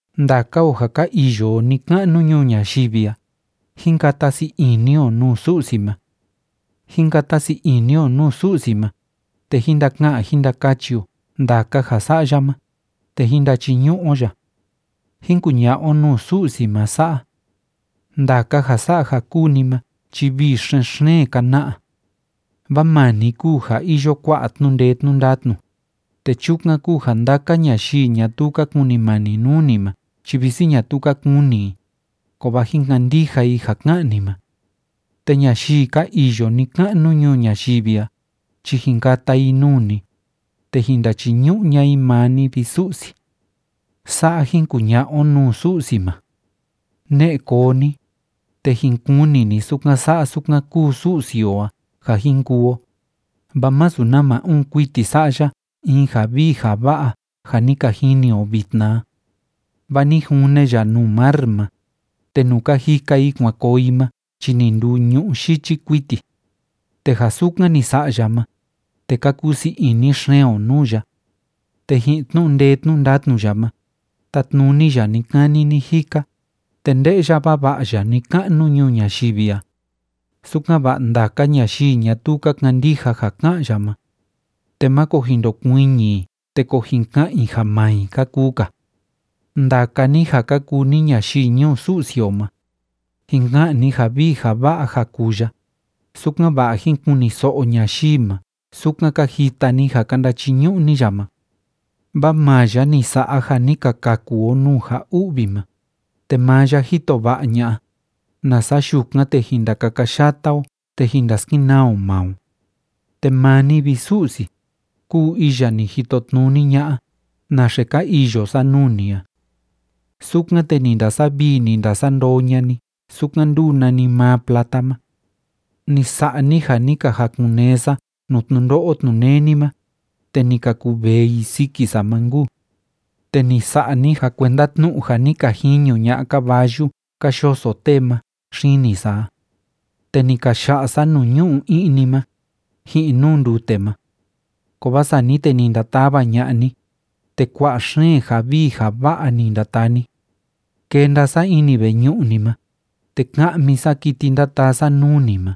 Ndaka o ja ka iyo o ni‑ka'nu ñuu ñayivi a, jín kata sii ini o nuu Su'si ma. Jín kata sii ini o nuu Su'si ma, te jín ndaka'an jín ndakachi o ndaka ja sa'a ya ma, te jín ndachiñu'u o ya. Jín kuña'a o nuu Su'si ma sa'a: “Ndaka ja sa'a ja kúu ni ma chi vii xen‑xeen ka na'a. Vaa maa ni kúu ja iyo kua'a tnu'u ndee tnu'u ndatnu, te chukan kúu ja ndaka ñayii ñatuu ka kunimani nuu ni ma chi visi ñatuu ka kuni i, kovaa jin kandija i ja ká'an ni ma. Te ñayii ka iyo ni‑ka'nu ñuu ñayivi a chi jin kata i nuu ni, te jin ndachiñu'u ña'a i maa ni, vi Su'si.” Sa'a jin kuña'a o nuu Su'si ma. Ne'e koo ni, te jin kuni ni sukan sa'a sukan kúu Su'si o a ja jin kuu o, vaa masu nama uun kuiti sa'a ya in ja vii ja va'a ja ni ka jini o vitna a. Vaa ni june ya nuu mar ma, te nuu ka jika i kuan koo i ma chi ni nduu ñu'ú yichi kuiti. Te ja sukan ni sa'a ya ma, te ka kusii ini xeen o nuu ya. Te ji'in tnu'u ndee tnu'u ndatnu ya ma, tátnuni ya ni‑kani ni‑jika, te nde'ya vava'a ya ni‑ka'nu ñuu ñayivi a, sukan‑va'a ndaka ñayii ñatuu ka kandija ja ká'an ya ma, te máko jin ndokuiñi i te ko jin ka'an i ja maa i ka kuu‑ka. Ndaka ni ja ka kuu ni ñayii ñuu Su'si o ma, jin ka'an ni ja vii ja va'a ja kuu ya, sukan‑va'a jín kuniso'o ñayii ma sukan ka jita ni ja ka ndachiñu'u ni ya ma. Vaa maa ya ni sa'a ja ni ka kaku o nuu ja u'vi ma, te maa ya jito va'a ña'a, nasa yukan, te jin ndakakayata o te jin ndaskenaa o maa o. Te maa ni, vi Su'si, kúu iya ni jitotnuni ña'a naxe ka iyo sa nuu ni a. Sukan, te ni ndasavii, ni ndasandoo ña'a ni sukan ndúu nanimaa plata ma. Ni sa'a ni ja ni ka jakun‑nee sa nuu tnundo'o tnuneni ma, te ni ka kuvee i siki sa ma nkuu. Te ni sa'a ni ja kuenda tnu'u ja ni ka jiñu ña'a caballu ka yoso tee ma xini sa a. Te ni ka ya'a sa nuu ñu'u i'ni ma, ji'in nuu ndute ma. Kovaa sani te ni ndatava ña'a ni, te kua'a xeen ja vii ja va'a ni ndataa ni. Kenda sa ini veñu'u ni ma, te ka'mi sa kiti ndataa sa nuu ni ma,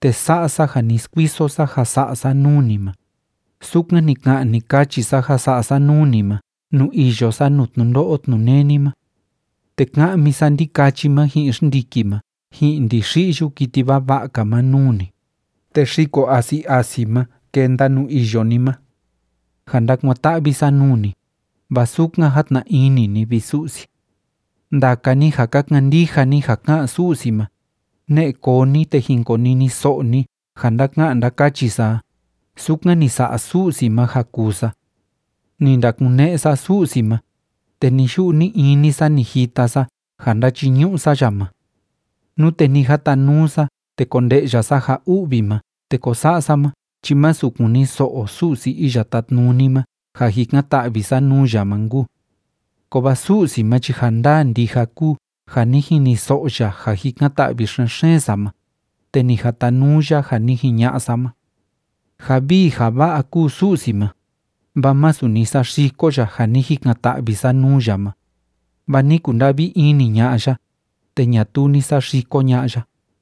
te sa'a sa ja ni skuiso sa ja sa'a sa nuu ni ma, sukan ni ka'an, ni kachi sa ja sa'a sa nuu ni ma nuu iyo sa nuu tnundo'o tnuneni ma. Te ka'mi sa ndikachi ma ji'in xndiki ma ji'in ndixi'yu kiti vava'a‑ka ma nuu ni, te xiko asi asi ma kenda nuu iyo ni ma, ja ndakuan‑ta'vi sa nuu ni, vaa sukan játna ini ni, vi Su'si. Ndaka ni ja ka kandija ni ja ká'an Su'si ma, ne'e koo ni, te jin koniniso'o ni ja ndáka'an ndákachi sa a sukan ni sa'a Su'si ma ja kuu sa. Ni ndakune'e sa Su'si ma, te ni‑yu'u ni‑ini sa ni jita sa ja ndáchiñu'u sa ya ma. Nute ni jatanuu sa te konde'ya sa ja u'vi ma te ko sa'a sa ma chi masu kuniso'o Su'si Iya Tátnuni ma ja jikan‑ta'vi sa nuu ya ma nkuu. Kovaa Su'si ma chi ja ndaa ndija kúu ja ni jiniso'o ya ja jikan‑ta'vi xen‑xeen sa ma, te ni jatanuu ya ja ni jiña'a sa ma. Ja vii ja va'a kúu Su'si ma, vaa masu ni saxiko ya ja ni jikan‑ta'vi sa nuu ya ma, vaa ni kunda'vi ini ña'a ya, te ñatuu ni saxiko ña'a ya.